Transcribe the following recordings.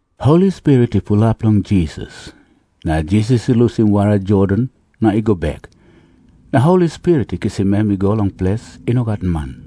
Holi Spirit i pulap long Jisas, na Jisas i lusim wara Jordan na i go bek. Na Holi Spirit i kisim em i go long ples i no gat man.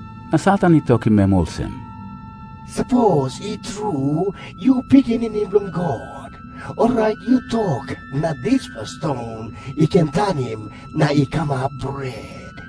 Na Satan i tokim em olsem, “Sapos i tru yu Pikinini Bilong God, orait yu tok na dispela ston i ken tanim na i kamap bret.”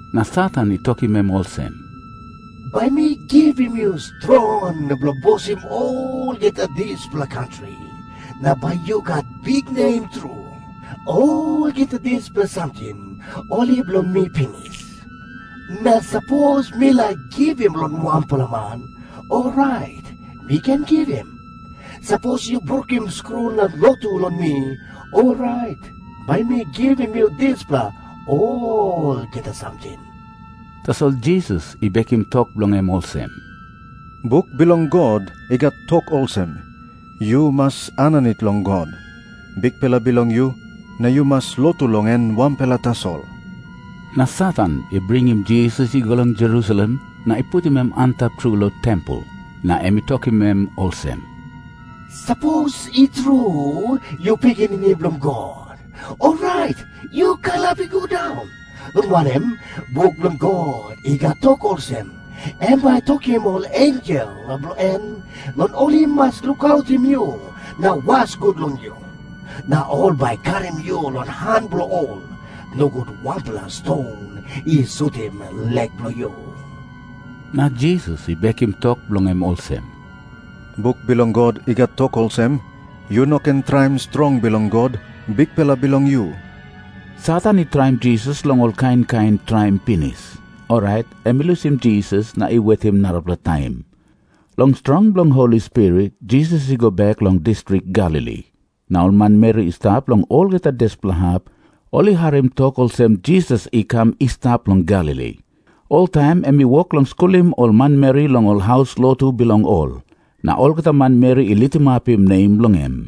Na Satan i tokim em olsem, “Bai mi givim yu strong bilong bosim olgeta dispela kantri, na bai yu gat biknem tru. Olgeta dispela samting ol i bilong mi pinis. Na sapos mi laik givim long wanpela man, orait mi ken givim. Sapos yu brukim skru na lotu long mi, orait bai mi givim yu dispela olgeta samting.” Tasol Jisas i bekim tok bilong em olsem, “Buk bilong God i gat tok olsem, ‘Yu mas aninit long God, Bikpela bilong yu, na yu mas lotu long em wanpela tasol.’” Na Satan i bringim Jisas i go long Jerusalem na i putim em antap tru long tempel. Na em i tokim em olsem, “Sapos i tru yu Pikinini Bilong God, orait yu kalap i go daun. Long wanem, buk bilong God i gat tok olsem, ‘Em bai i tokim ol ensel bilong en long ol i mas lukautim yu na was gut long yu.’ Na ‘Ol bai i karim yu long han bilong ol, nogut wanpela ston i sutim lek bilong yu.’” Na Jisas i bekim tok bilong em olsem, “Buk bilong God i gat tok olsem, ‘Yu no ken traim strong bilong God, Bikpela bilong yu.’” Satan i traim Jisas long ol kain kain traim pinis, orait em i lusim Jisas na i wetim narapela taim. Long strong bilong Holi Spirit, Jisas i go bek long distrik Galili. Na ol manmeri i stap long olgeta dispela hap, ol i harim tok olsem Jisas i kam i stap long Galili. Oltaim em i wok long skulim ol manmeri long ol haus lotu bilong ol. Na olgeta manmeri i litimapim nem bilong em.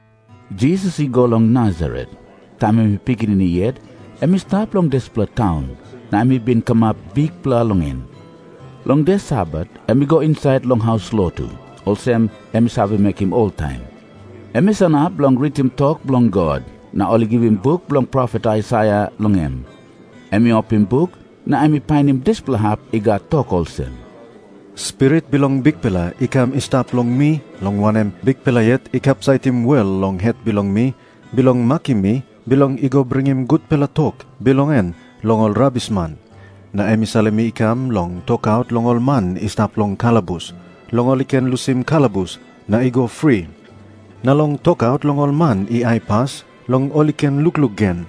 Jisas i go long Nasaret. Taim em i pikinini yet, em i stap long dispela taun, na em i bin kamap bikpela long en. Long de Sabat em i go insait long haus lotu, olsem em i save mekim oltaim. Em i sanap bilong ritim tok bilong God, na ol i givim buk bilong profet Aisaia long em. Em i opim buk, na em i painim dispela hap i gat tok olsem, “Spirit bilong Bikpela i kam i stap long mi, long wanem, Bikpela yet i kapsaitim wel long het bilong mi bilong makim mi bilong i go bringim gutpela tok bilong en long ol rabisman. Na em i salim mi i kam long tokaut long ol man i stap long kalabus long ol i ken lusim kalabus na i go fri, na long tokaut long ol man i aipas long ol i ken lukluk gen.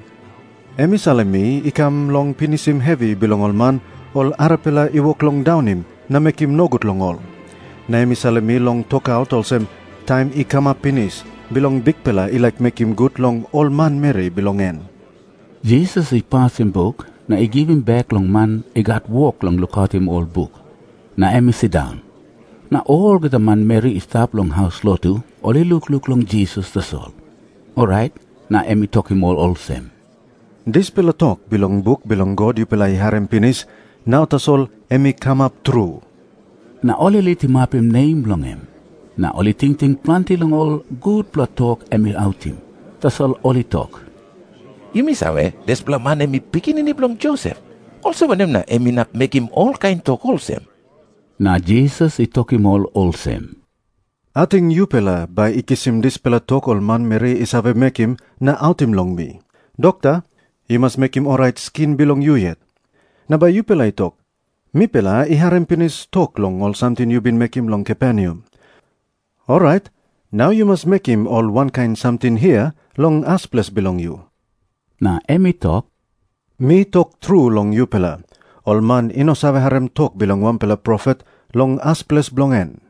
Em i salim mi i kam long pinisim hevi bilong ol man, ol arapela i wok long daunim na mekim nogut long ol. Na em i salim mi long tokaut olsem, taim i kamap pinis bilong Bikpela i laik mekim gut long ol manmeri bilong en.” Jisas i pasim buk na i givim bek long man i gat wok bilong lukautim ol buk, na em i sindaun. Na olgeta manmeri i stap long haus lotu ol i lukluk long Jisas tasol. Orait na em i tokim ol olsem, “Dispela tok bilong buk bilong God yupela i harim pinis, nau tasol em i kamap tru.” Na ol i litimapim nem bilong em, na ol i tingting planti long ol gutpela tok em i autim. Tasol ol i tok, “Yumi save, dispela man em i pikinini bilong Josep. Olsem wanem na em inap mekim olkain tok olsem?” Na Jisas i tokim ol olsem, “Ating yupela bai i kisim dispela tok ol manmeri i save mekim na autim long mi, ‘Dokta, yu mas mekim orait skin bilong yu yet.’ Na bai yupela i tok, ‘Mipela i harim pinis tok long ol samting yu bin mekim long Kaperneam. Orait nau yu mas mekim ol wankain samting hia long as ples bilong yu.’” Na em i tok, “Mi tok tru long yupela, ol man i no save harim tok bilong wanpela profet long as ples bilong en.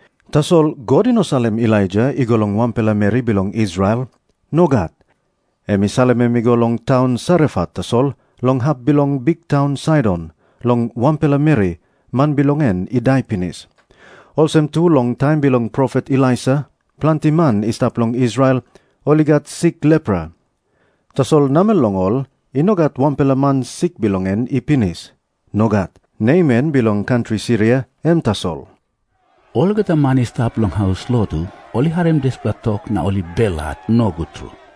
Tasol God i no salim Elaija i go long wanpela meri bilong Israel. Nogat. Em i salim em i go long taun Sarefat tasol long hap bilong biktaun Saidon, long wanpela meri, man bilong en i dai pinis. Olsem tu long taim bilong profet Elisa planti man i stap long Israel, ol i gat sik lepra. Tasol namel long ol i no gat wanpela man sik bilong en i pinis. Nogat. Naman bilong kantri Siria em tasol.” Olgeta man i stap long haus lotu ol i harim dispela tok, na ol i belhat nogut tru.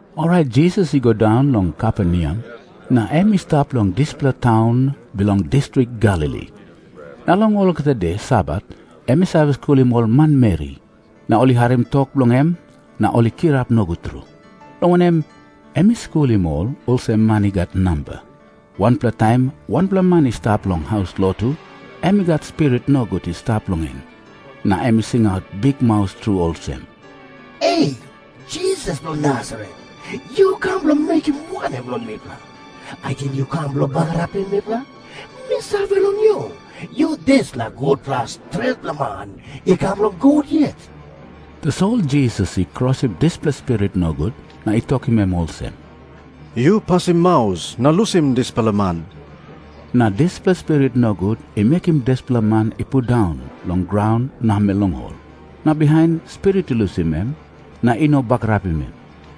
Orait Jisas i go daun long Kaperneam, na em i stap long dispela taun bilong distrik Galili. Na long olgeta de Sabat em i save skulim ol manmeri. Na ol i harim tok bilong en na ol i kirap nogut tru, long wanem, em i skulim ol olsem man i gat namba. Wanpela taim wanpela man i stap long haus lotu, em i gat spirit nogut i stap long en. Na em i singaut bikmaus tru olsem, “E, Jisas bilong Nasaret, yu kam bilong mekim wanem long mipela? Ating yu kam bilong bagarapim mipela? Mi save long yu. Yu dispela gutpela stretpela man i kam long God yet.” Tasol Jisas i krosim dispela spirit nogut na i tokim em olsem, “Yu pasim maus na yu lusim dispela man.” Na dispela spirit nogut i mekim dispela man i pundaun long graun namel long ol, na bihain spirit i lusim em, na i no bagarapim em.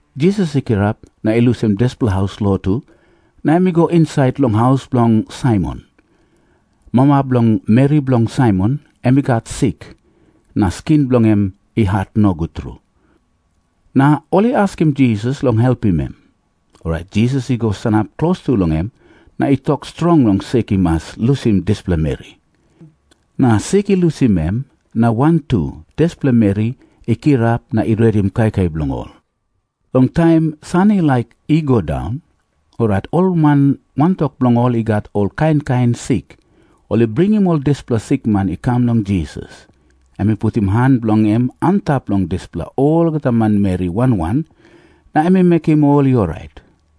Jisas i kirap na i lusim dispela haus lotu, na em i go insait long haus bilong Saimon. Mama bilong meri bilong Saimon em i gat sik, na skin bilong en i hat nogut tru. Na ol i askim Jisas long helpim em. Orait Jisas i go sanap klostu long em na i tok strong long sik i mas lusim dispela meri. Na sik i lusim em, na wantu dispela meri i kirap na i redim kaikai bilong ol. Long taim san i laik i go daun, orait ol man wantok bilong ol i gat ol kain kain sik, ol i bringim ol dispela sikman i kam long Jisas. Em i putim han bilong en antap long dispela olgeta manmeri wan wan, na em i mekim ol i orait.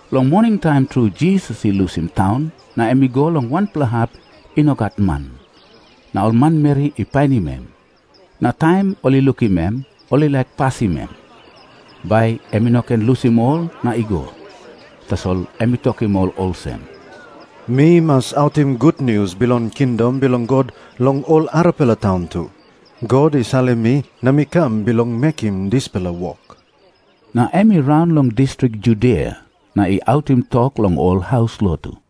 Long moningtaim tru Jisas i lusim taun na em i go long wanpela hap i no gat man. Na ol manmeri i painim em, na taim ol i lukim em ol i laik pasim em, bai em i no ken lusim ol na i go. Tasol em i tokim ol olsem, “Mi mas autim gutnius bilong kingdom bilong God long ol arapela taun tu. God i salim mi na mi kam bilong mekim dispela wok.” Na em i raun long distrik Judia na i autim tok long ol haus lotu.